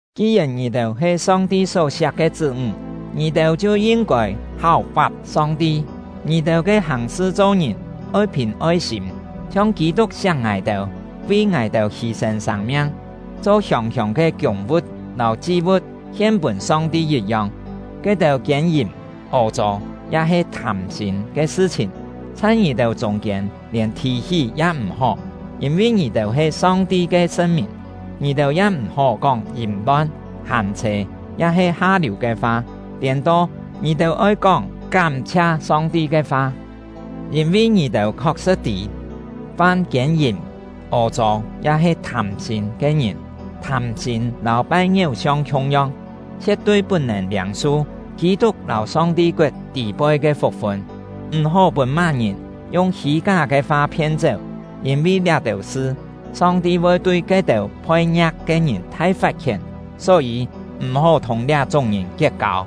Ki-yèn ngì-têu he Song-ti só-siak ke chṳ́-ńg, ngì-têu chhiu yin-kôi háu-fap Song-ti. Ngì-têu ke hàng-sṳ cho-ngìn oi phìn oi-sîm, chhiong Kî-tuk siak ngài-têu, vi ngài-têu hî-sên sâng-miang, cho hiông-hiông ke kiûng-vu̍t lâu chi-vu̍t hien-pûn Song-ti yit-yong. Ke-têu kiên-yìm, ô-chô, ya-he thâm-sîm ke sṳ-chhìn, chhai ngì-têu chûng-kiên lièn thì-hí ya m̀-hó, yîn-vi ngì-têu he Song-ti ke sṳn-mìn. Ngì-têu ya m̀-hó kóng yìm-lon, hâm-chhê, ya-he ha-liù ke fa; tiên-to, ngì-têu oi kóng kám-chhia Song-ti ke fa. Yîn-vi ngì-têu khok-sṳ̍t tî, fam kiên-yìm, ô-chô, ya-he thâm-sîm ke ngìn (thâm-sîm lâu pai ngiéu-siong khiung-yong) chhie̍t-tui put-nèn liâng-su Kî-tuk lâu Song-ti koet tî-poi ke fuk-fun. M̀-hó pûn má-ngìn yung hî-ká ke fa phien-chéu; yîn-vi liá-têu sṳ, Song-ti voi tui ke-têu phoi-ngia̍k ke ngìn thai fat-khién. Só-yî, m̀-hó thùng liá-chúng ngìn kiet-kâu.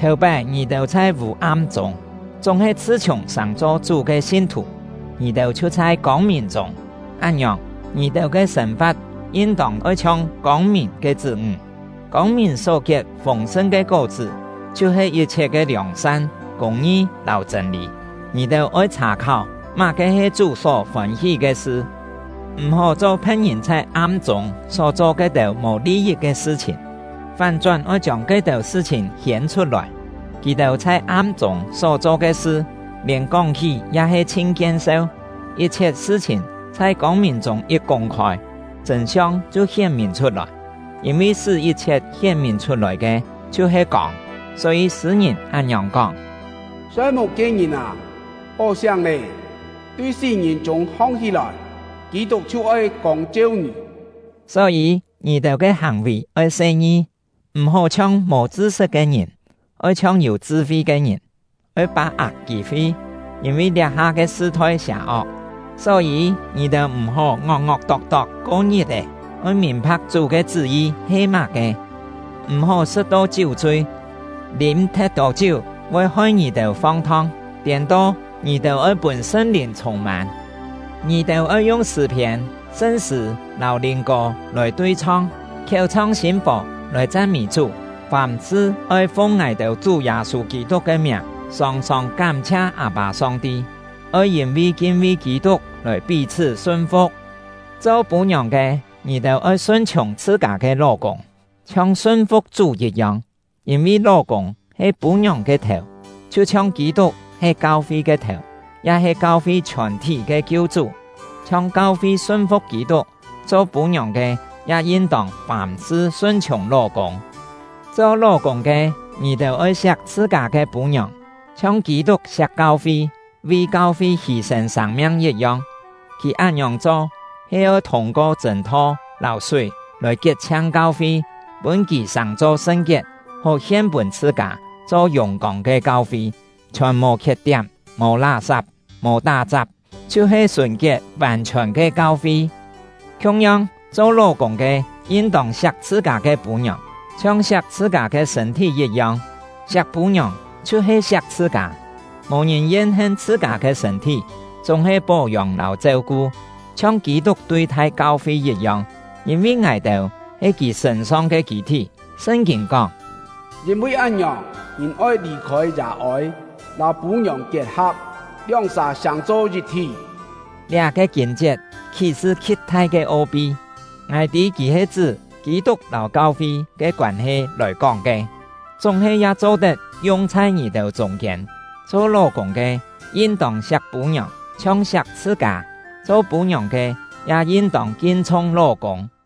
Thèu-pái ngì-têu chhai vû-am chûng, chúng-he chhṳ-chhiùng sàng-cho Chú ke sin-thù, ngì-têu chhiu chhai kông-mìn chûng; án-ngiòng, ngì-têu ke sên-fa̍t yin-tông oi chhiong kông-mìn ke chṳ́-ńg. Kông-mìn só kiet fûng-sṳn ke kó-chṳ́ chhiu-he yit-chhiet ke liòng-san, kûng-ngi, lâu chṳ̂n-lî. Ngì-têu oi chhà-kháu má-ke he Chú só fôn-hí ke sṳ. M̀-hó cho phe̍t-ngìn chhai am-chûng só cho ke-têu mò li-yit ke sṳ-chhìn, fán-chón oi chiông ke-têu sṳ-chhìn hiên-chhut-lòi. (Kì-têu chhai am-chûng só-cho ke sṳ, lièn kóng-hí ya he chhin kien-seu!) Yit-chhiet sṳ-chhìn chhai kông-mìn chûng yit kûng-khôi, chṳ̂n-siong chhiu hién-mìn chhut-lòi; yîn-vi sṳ́ yit-chhiet hién-mìn chhut-lòi ke chhiu-he kông. Só-yî, sṳ̂-ngìn án-ngiòng kóng: Soi-muk ke ngìn â, hó siáng lé! Tui sí-ngìn chûng hong-hí-lòi! Kî-tuk chhiu oi kông-cheu ngì. Só-yî, ngì-têu ke hàng-vì oi se-ngi. M̀-hó chhiong mò chṳ-sṳt ke ngìn, oi chhiong yû chṳ-fi ke ngìn. Oi pá-ak kî-fi, yîn-vi liá-ha ke sṳ-thoi sià-ok. Só-yî, ngì-têu m̀-hó ngok-ngok tok-tok ko ngit-è; oi mìn-pha̍k Chú ke chṳ́-yi he má-ke. M̀-hó sṳ̍t-to chiú-chui, lîm thet-tô chiú voi hoi ngì-têu fong-thong; tiên-to, ngì-têu oi pûn Sṳn-Lìn chhûng-mân. Ngì-têu oi yung sṳ̂-phiên, sṳn-sṳ̂, lâu lìn-kô lòi tui-chhong, khiéu chhong sîm fò lòi chan-mî Chú. Fàm-sṳ oi fung ngài-têu Chú Yâ-sû Kî-tuk ke miàng, sòng-sòng kám-chhia Â-pâ Song-ti. Oi yîn-vi kin-vi Kî-tuk lòi pí-chhṳ́ sun-fu̍k. Cho pû-ngiòng ke, ngì-têu oi sun-chhiùng chhṳ-kâ ke ló-kûng, chhiong sun-fu̍k Chú yit-yong. Yîn-vi ló-kûng he pû-ngiòng ke thèu, chhiu-chhiong Kî-tuk he kau-fi ke thèu, ya he kau-fi chhiòn-thí ke Kiu-chú. Chhiong kau-fi sun-fu̍k Kî-tuk, cho pû-ngiòng ke ya yin-tông fàm-sṳ sun-chhiùng ló-kûng. Cho ló-kûng ke, ngì-têu oi siak chhṳ-kâ ke pû-ngiòng, chhiong Kî-tuk siak kau-fi, vi kau-fi hî-sên sâng-miang yit-yong. Kì án-ngiòng cho he oi thûng-ko chṳ̂n-tho lâu súi lòi kiet-chhiang kau-fi, pûn kì sàng-cho sṳn-kiet, hó hien-pûn chhṳ-kâ, cho yùng-kông ke kau-fi, chhiòn mò khiet-tiám, mò lá-sap, mò tá-chap, chhiu-he sùn-kiet vàn-chhiòn ke kau-fi. Khiung-yong, cho ló-kûng ke yin-tông siak chhṳ-kâ ke pû-ngiòng, chhiong siak chhṳ-kâ ke sṳ̂n-thí yit-yong; siak pû-ngiòng chhiu-he siak chhṳ-kâ. Mò ngìn yen-hen chhṳ-kâ ke sṳ̂n-thí, chúng-he pó-yông lâu cheu-ku, chhiong Kî-tuk tui-thai kau-fi yit-yong; yîn-vi ngài-têu he kì sṳ̂n-song ke kî-thí. Sṳn-kîn kóng: “Yîn-vi án-ngiòng, ngìn oi lì-khôi yà-ôi, lâu pû-ngiòng kiet-ha̍p, lióng-sà sàng-cho yit-thí.” Liá-ke kîn-chiet khí-sṳ khi̍t-thai ke o-pi. Ngài tî kì he chṳ́ Kî-tuk lâu kau-fi ke koân-he lòi kóng ke, chúng-he ya cho-tet yung chhai ngì-têu chûng-kiên: Cho ló-kûng ke yin-tông siak pû-ngiòng, chhiong siak chhṳ-kâ; cho pû-ngiòng ke ya yin-tông kin-chhung ló-kûng.